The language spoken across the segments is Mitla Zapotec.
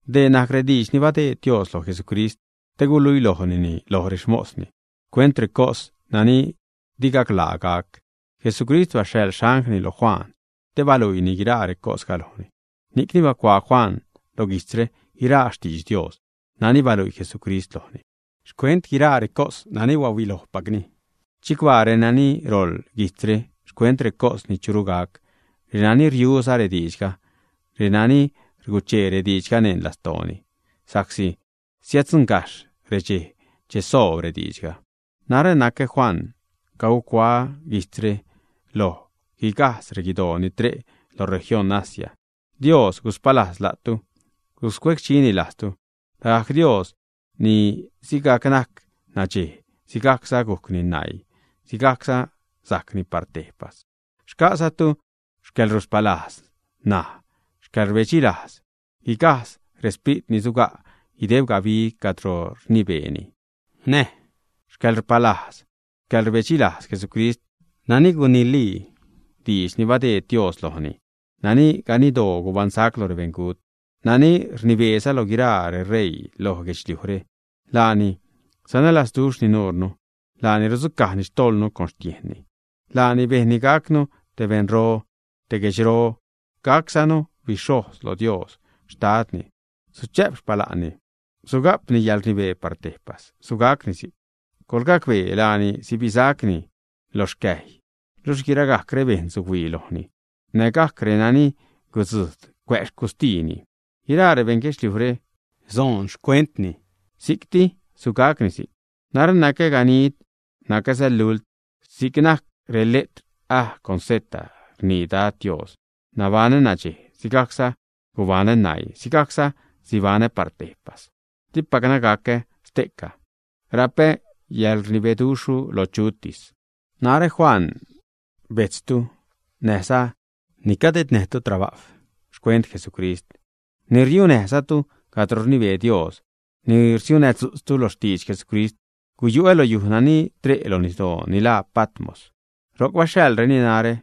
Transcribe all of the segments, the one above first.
Dee najc rediidx ni badeed Dios loj Jesucrist te guluilojnini loj rexmosni, xcuent recos nani di gaclaa gac. Jesucrist baxhaḻ xanglni lo Juan, te baluiini guiraa recosga lojni. Ni'cni bacuaa Juan lo guijtzre guiraa xtidx Dios nani baluii Jesucrist lojni, xcuent guiraa recos nani bahuilojpacni. Chicbaa renani roḻ guijtzre xcuent recos ni churu gac, renani riuza rediidxga, renani rguchee rediidxga neṉ lastooni sa'csi siäddzuṉgajxh redxej che soob rediidxga. Narä nacä Juan. Cagucuaä guijtzre loj guigajdz reguidoo ni tre' lo región Asia. Dios guspalajz la'tu, guscuecdxini lajtzu, lagajc Dios ni sigajc najc nadxej, sigajcza gujcni naii, sigajcza sajcni par tejpas. Xca'zatu xcäḻruspalajz näj xcäḻrbedxilajz guigajdz resprit ni suga' guideb gabi cadro rnibeeni, näj xcäḻruspalajz, xcäḻrbedxilajz Jesucrist nani gunilii diidx ni badeed Dios lojni, nani ganiddoo gubaṉsac lo rebeṉgut, nani rnibeeza lo guiraa reṟeii loj guedxliujre. Laani sanälazduxhni nuure, laani rudzucajni xtojḻnu con xtiejnni. Laani bejnni gacnu te beṉro, te guedxro, gaczanu bixhojz lo Dios Xtadni. Suchä'p xpala'nni, suga'pni yäḻrnibee par tejpas. Sugacni si'c. ¡Coḻgacbee! Laani sibisacni lo rexcäjy, luxh guiragajc rebejṉ suhuii lojni, nägajc renani gudzujd cuä' xcustiini. Guiraa rebejṉ guedxliujre soon xcuentni. Si'cti, sugacni si'c. ―Narä nacä ganid, nacäza lult, si'c najc reletr A con Z ―rnii Dad Dios―. Nabaṉä nadxej, sigajcza gubaṉä naii, sigajcza sibanä par tejpas, dipacna gacä ste'ca. Rapä yäḻrnibeduxhru lo chutis. Narä, Juan, bejtztu, näjza ni cadednäjtu trabajw xcuent Jesucrist, ni riunäjzatu cadro rnibee Dios, ni rsiudzutznäjzatu lo xtidx Jesucrist, guyu'ä lo yuj nani tre' lo nisdoo, ni laa Patmos. Ro'c baxhaḻreni narä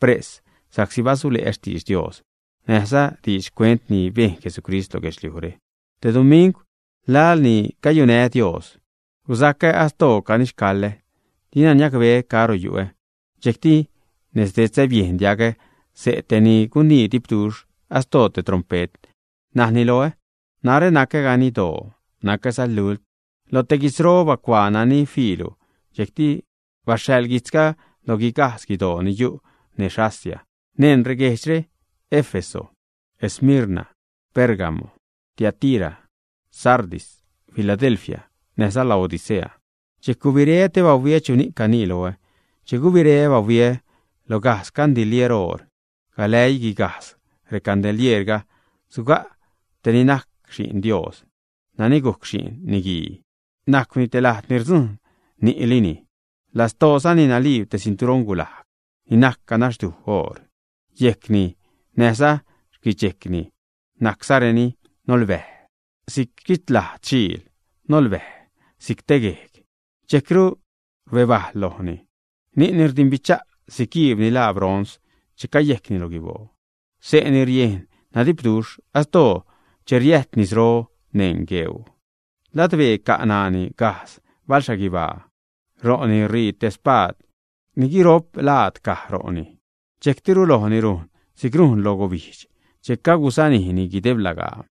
pres sa'csi basule'ä xtidx Dios näjza diidx xcuent ni bejn Jesucrist lo guedxliujre. Te dumingw, laḻ ni cayunää́ Dios, guzacä astoo canixcaḻä, dina niacbeä caro yu'ä, dxejcti nez detzä biejn diagä xse' te ni gunii dipduxh, astoo te trompet, najni loä: ―Narä nacä ganiddoo, nacäza lult. Lo te guitzro bacuaa nani fiilu, dxejcti baxhaḻ guijtzga loj guigajdz guidoo ni yu' nez Asia, neṉ reguejdxre: Éfeso, Esmirna, Pérgamo, Tiatira, Sardis, Filadelfia, näjza Laodicea. Dxejc gubireä te bahuiä chuni'c canii loä. Che gubireä bahuiä lo gajdz gandilier oor. Galäii guigajdz recandilieerga, suga' te ni najc Xi'n Dios nani gujc Xi'n Niguii, najcwni te lajd ni rdzujṉ lo ni'lini, lastoozani naliib te cinturoṉ gulajg ni najc ganaxduj oor. Yejcni näjza xquidxejcni najczareni nolbäj si'c xquichlajd xiil, nolbäj si'c yejg. Dxejcru rbebajl lojni. Ni'ni rdimbicha' si'c guiib ni laa bronz che cayejcni lo guiboo. Xse'ni riejn nadipduxh astoo che riäjt nisro neṉ regueuu. Ladbee ca' ṉaani gajdz balxhaguibaa; ro'ni rii te espaad ni guiro'p laad caj ro'ni; dxejctiru lojni rujn si'c rujn loj gubijdx che cagusanijni guideb lagaa.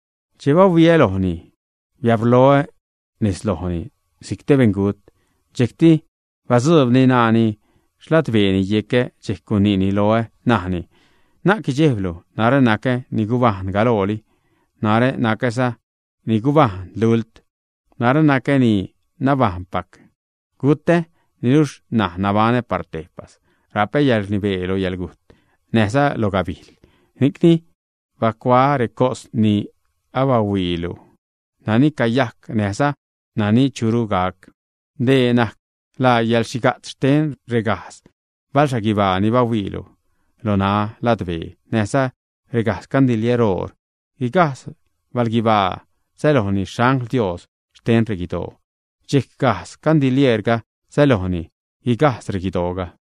Che bahuiä lojni, biabrloä nez lojni si'c te beṉgut. Dxejcti batzuubni ṉaani xladbeeni yecä, dxejc guniini loä, najni: ―Na'c guidxejblu, narä nacä ni gubajṉ galooli, narä nacäza ni guibajṉ lult. Narä nacä ni nabajṉpac; gutä, niluxh ṉaj nabaṉä par tejpas. Rapä yäḻrnibee lo yäḻgujt näjza lo gabijl. Ni'cni bacuaa recos ni abahuiilu, nani cayajc ṉaj, näjza nani churu gac. Dee najc laa yäḻxhiga'tz xten regajdz balxhaguibaa ni bahuiilu lo ṉaä ladbee näjza regajdz gandilier oor: guigajdz balguibaa sälojni xangl Dios xten reguidoo. Dxejc gajdz gandilieerga sälojni guigajdz reguidooga.